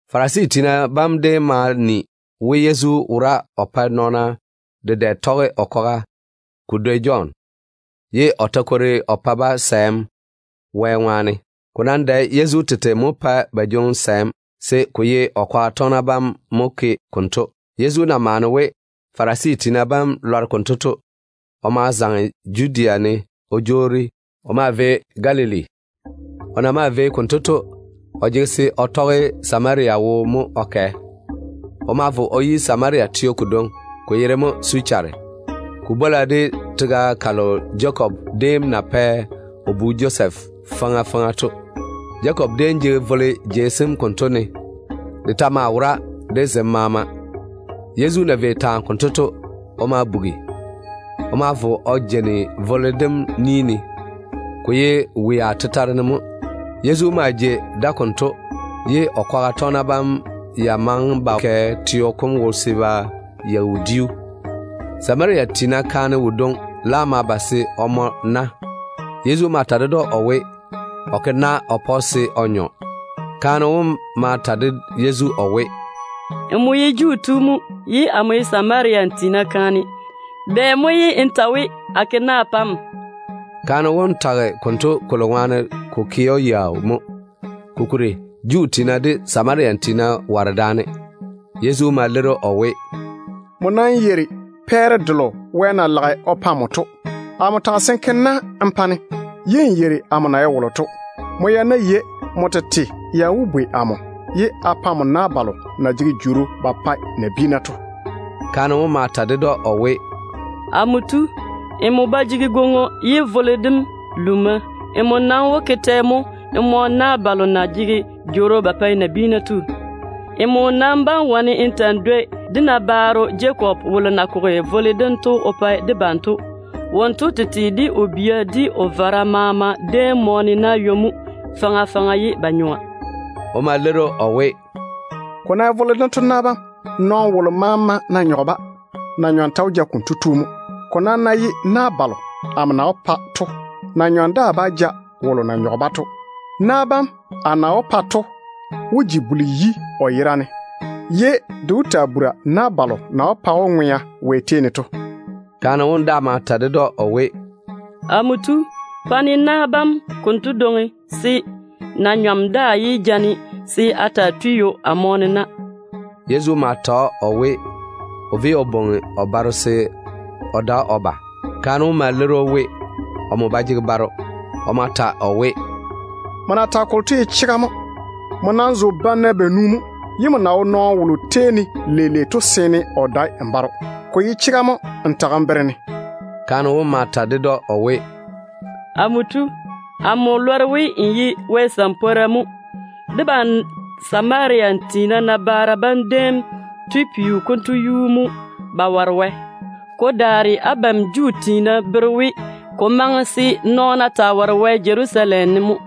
Farisi tiina bam déem ma ni we Yezu wora o pae nɔɔna dedɛ tɔge o kwaga ko dwoi Jɔn, ye o ta kwori o pa-ba sɛɛm Wɛ ŋwaane. Ko nam dae Yezu tete mo pɛ ba jwoŋi sɛɛm, se ko ye o kwaga tɔgena bam mo ke konto. Yezu na maane we Farisi tiina bam lɔre konto to, o ma zaŋe Judea ne o jwoori o maa vei Galili. O na maa vei konto to, o jege se o tɔge Samaria wo mo o kɛ. O ma vo o yi Samaria teo kodwoŋi, ko yere mo Suchare. Ko bwola de tega kalo Jakob déem na kwei o pa o bu Josɛf faŋa faŋa to. Jakob déem jege vole jei sem konto ne. De ta maa wora de zem maama. Yezu na vei taa konto to, o ma bugi. O ma vo o jeini vole dem ni ne. Wea maa wo yupare baŋa ne. Yezu maa jei da konto, ye o kwaga tɔgena bam ya maŋe ba kɛ teo kom wo se ba yeigi wodiu. Samaria tiina kaane wodwoŋi laam ma ba se o mɔ na. Yezu ma ta ded‑o o we, o ke na o pa‑o se o nyɔ. Kaane wom ma ta de Yezu o we, “Nmo ye Juu tu mo, ye amo ye Samaria tiina kaane. Bɛ mo ye n ta we, a ke na a pa‑m?” Kaane wom tage konto kolo ŋwaane ko ke‑o yaau mo, kokuri Juu tiina de Samaria tiina ware daane. Yezu ma leiri‑o o we, “Nmo nam yeiri pɛɛre delo Wɛ na lage o pa nmo to. Amo taga se n ke na n pa-ne, ye n yeiri amo na ye wolo to. Nmo ya ná yei, nmo tete ya wó bwei amo, ye a pa nmo na balo na jege ŋwea ba pae nabiina to.” Kaane wom ma ta ded‑o o we, “Amo tu, nmo ba jege gwoŋo, ye vole dem luuna. Nmo nam wó ke tɛ mo n mɔ na balo na jege jworo ba pae nabiina to? Nmo nam bá wane n ta‑n dwoi dé nabaaro Jakob wolo déem na koge vole dento o pa debam to. Wonto tete, de o bia, de o vara maama déem mɔɔne na ywo-seeni mo faŋa faŋa ye ba nyɔa.” O ma leiri‑o o we, “Ko ná ye vole dento na bam, nɔɔno wolo maama ná nyɔge-ba, na-nyɔm ta wó ja kotu mo. Ko nam ná ye na balo amo na wó pa nɔɔna to, na-nyɔm daa bá ja wolo na nyɔge-ba to. Na bam a na wó pa to wó ji buli-yi o yera ne, ye de wó taa bura na balo na wó pa‑o ŋwea kalo na ba jege kweelim Wɛ tei ne to.” Kaane wom daa ma ta ded‑o o we, “Amo tu, pa-ne na bam konto dwoŋi, se na-nyɔm daa yé ja-ne se a taa tui ywo a mɔɔne na.” Yezu ma ta‑o o we, o véi o bwoŋi o baro se o da o ba. Kaane wom ma leiri we, omo ba jege baro. O ma ta o we, “Nmo na tage kolo to ye chega mo. Nmo nam zo banna banu mo, ye nmo na wo nɔɔno wolo tei ne leile to seene o dae n baro. Ko ye chega mo n tage n bere-ne.” Kaane wom ma ta ded‑o o we, “Amo tu, amo lɔre we n ye Wɛ ni-jwoŋinu mo. Debam Samaria tiina nabaara bam déem tui peo konto yuu mo ba ware Wɛ. Ko daare abam Juu tiina bere we, ko maŋe se nɔɔna taa ware Wɛ Jerusalem teo ne mo.”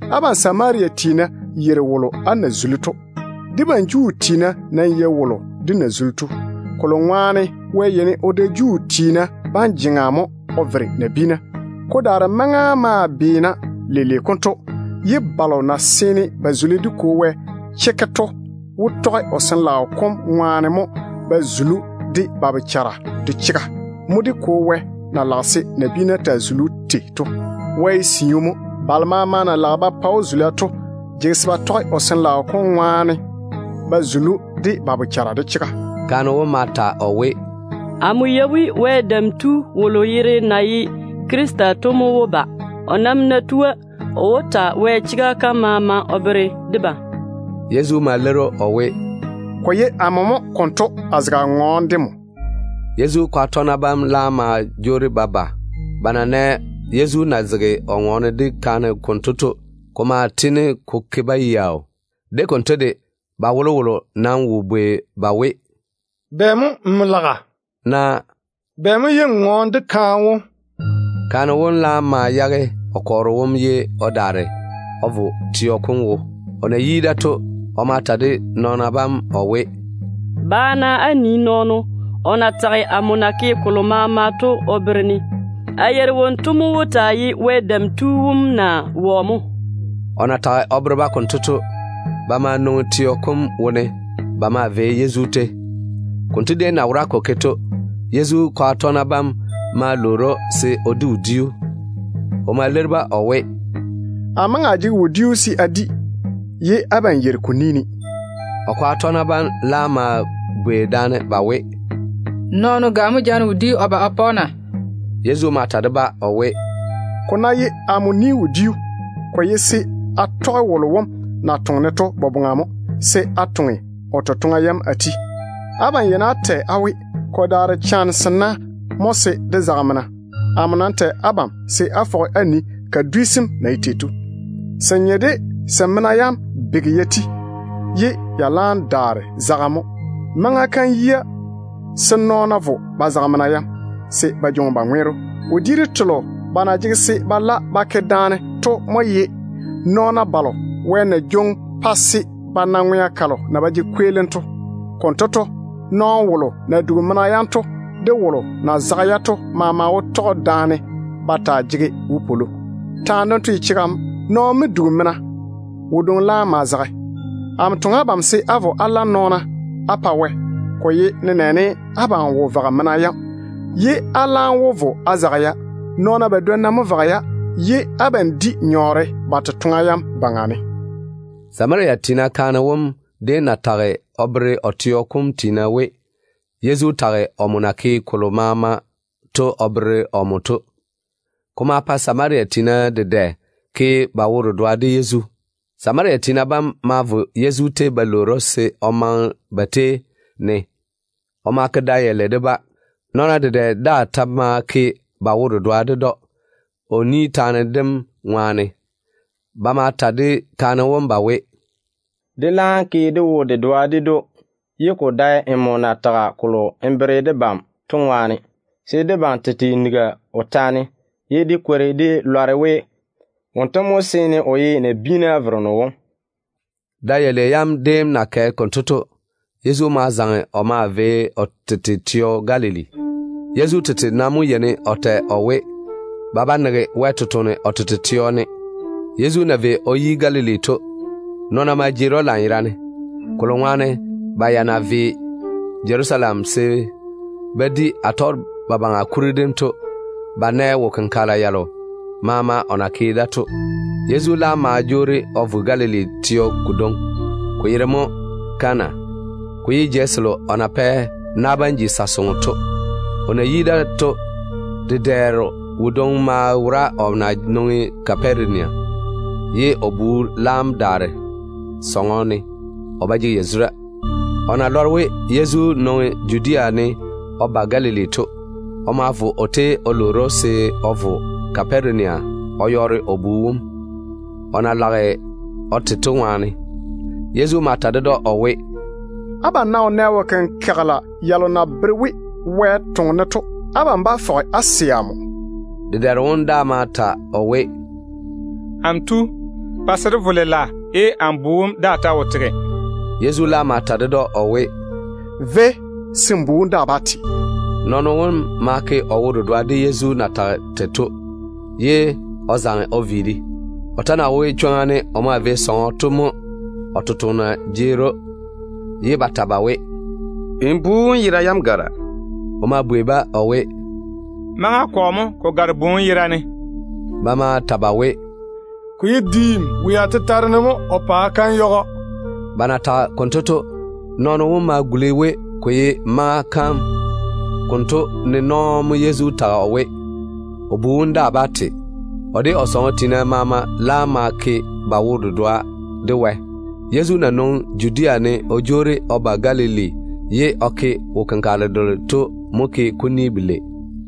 Abam Samaria tiina yeiri wolo á na zuli to. Debam Juu tiina nam yei wolo dé na zuli to, kolo ŋwaane Wɛ yeini o da Juu tiina bam jeŋa mo o vere nabiina. Ko daare maŋa maa beena leile konto, ye balo na seene ba zuli dé Kwo Wɛ chekke to wó tɔge o Sin-laao kom ŋwaane mo ba zuli‑o de ba bochara de chega. Mo dé Kwo Wɛ na lage se nabiina taa zuli‑o tei to. Wɛ ye siu mo. Balo maama na lage ba pa‑o zula to jege se ba tɔge o Sin-laao kom ŋwaane ba zuli‑o de ba bochara de chega.” Kaane wom ma ta o we, “Amo yei we Wɛ Dam Tu wolo yere na ye Krista to mo wó ba. O nam ná tua, o wó ta Wɛ chega kam maama o bere debam.” Yezu ma leiri‑o o we, “Ko ye amo mo konto, a zege a ŋɔɔne de nmo.” Yezu kwaga tɔgena bam laam ma jwoori ba ba. Ba na nɛ Yezu na zege o ŋɔɔne de kaane konto to, ko ma tiini ko ke-ba yaau. De konto de, ba wolowolo nam wo bwei ba we, “Bɛ mo nmo laga?” naa “Bɛ mo ye n ŋɔɔne de kaane wom?” Kaane wom laam ma yage o kɔɔro wom ye o daare o vo teo kom wo. O na yi da to, o ma ta de nɔɔna bam o we, “Ba-na á nii nɔɔno, o na tage amo na ke kolo maama to o bere-ne. A yeiri wonto mo wó taa ye Wɛ Dam Tu wom naa wɔ mo.” O na tage o bere-ba konto to, ba ma nwoŋi teo kom wone ba maa vei Yezu tei. Konto déem na wora ko ke to, Yezu kwaga tɔgena bam ma lwoori‑o se o di wodiu. O ma leiri-ba o we, “Amo maŋe a jege wodiu se a di, ye abam yeiri ko ni ne.” O kwaga tɔgena bam laam ma bwei daane ba we, “Nɔɔno ga mo jaane wodiu o ba o pa‑o na?” Yezu ma ta de-ba o we, “Ko ná ye amo ni-wodiu, ko ye se a tɔge wolo wom na toŋe-ne to boboŋa mo, se a toŋe o totoŋa yam a ti. Abam yeini á tɛ á we, ‘Ko daare chane sena mo se dé zage mena.’ Amo nam tɛ abam se á fɔge á nii kadwi sem na ye tei. Se nye de se mena yam bege ya ti, ye ya laam daare zagem mo. Maŋa kam yia se nɔɔna vo ba zage mena yam, se ba daare ba jwoŋi ba ŋweero. Wodiiru telo ba na jege se ba la ba ke daane to mo ye nɔɔna balo Wɛ na jwoŋi pa se ba na ŋwea kalo na ba jege kweelim to. Konto to, nɔɔno wolo na dugi mena yam to de wolo na zage-ya to maama wó tɔge daane ba di ywoni. Taane dento ye chega mo: ‘Nɔɔno mo dugi mena, wodwoŋi laam ma zage.’ Amo toŋe abam se á vo á la nɔɔna á pa Wɛ. Ko ye nenɛɛne abam wo vage mena yam, ye á laam wó vo á zage-ya. Nɔɔna badwonna mo vage-ya, ye abam di nyɔɔre ba totoŋa yam baŋa ne.” Samaria tiina kaane wom ya tage o bere o teo kom tiina we, Yezu tage omo na ke kolo maama to o bere-o. Ko ma pa Samaria tiina dedɛ ke ba wo-dedoa de Yezu. Samaria tiina bam ma vo Yezu tei ba lwoori‑o se o dáane ba tei ne. O ma ke da yalei de-ba. Nɔɔna dedɛ daa ta ma ke ba wo-dedoa ded‑o, o ni taane dem ŋwaane. Ba ma ta de kaane wom ba we, “Dé laam ke dé wo-dedoa ded‑o, ye ko dae nmo na tage kolo n bere debam to ŋwaane, se debam tete nigi o taane, ye dé kwori dé lɔre we, wonto mo seene o ye nabiina Vereno wom.” Da yalei yam déem na kɛ konto to mo Yezu zaŋe o maa vei Galili laŋa kam. Yezu tete nam mo yeini o tɛ o we, ba ba nege Wɛ ni-jwoŋinu o tete teo ne. Yezu na vei o yi Galili to, nɔɔna ma jeeri‑o lanyerane, kolo ŋwaane ba ya na vei Jerusalem se ba di Atɔgebabaŋa kuri dem to, ba nɛ wo-kenkagela yalo maama o na ke da to. Yezu laam ma jwoori o vo Galili teo kodwoŋi, ko yere mo Kana. Ko maa ye jei selo o ya na pɛ na bam ji sa-soŋo da to. O na yi da to, dedɛɛro wodwoŋi maa wora o na nwoŋi Kaparenia, ye o bu laam daare sɔŋɔ ne, o ba jege yazura. O na lɔre we Yezu nwoŋi Judea ne o ba Galili to, o ma vo o tei o lwoori‑o se o vo Kaparenia o yɔɔre o bu wom, o na lage o te to ŋwaane. Yezu ma ta ded‑o o we, “Abam ná wo nɛ wo-kenkagela yalo na bere we Wɛ toŋe-ne to, abam bá fɔge á sɛ amo.” Dedɛɛro wom daa ma ta o we, “Amo tu, pa se dé vo lela ye amo bu wom daa ta wo tege.” Yezu laam ma ta ded‑o o we, “Véi, se n bu wom daa bá te.” Nɔɔno wom ma ke o wo-dedoa de Yezu na tage tei to, ye o zaŋe o viiri. O ta na wo chwoŋa ne o maa vei sɔŋɔ to mo o tontoŋena jeeri‑o, ye ba ta ba we, “N bu wom yera yam gara.” O ma bwei-ba o we, “Maŋa kɔ mo ko gare bu wom yera ne?” Ba ma ta ba we, “Ko ye diim, wea tetare ne mo, o paa kam yage‑o.” Ba na tage konto to, nɔɔno wom ma guli we ko ye maŋa kam konto ne nɔɔ mo Yezu tage o we, o bu wom daa bá te. O de o sɔŋɔ tiina maama laam ma ke ba wo-dedoa de Wɛ. Konto to, Yezu na nwoŋi Judea ne o jwoori o ba Galili ye o ke wo-kenkagele delo to mo ke kuni belei.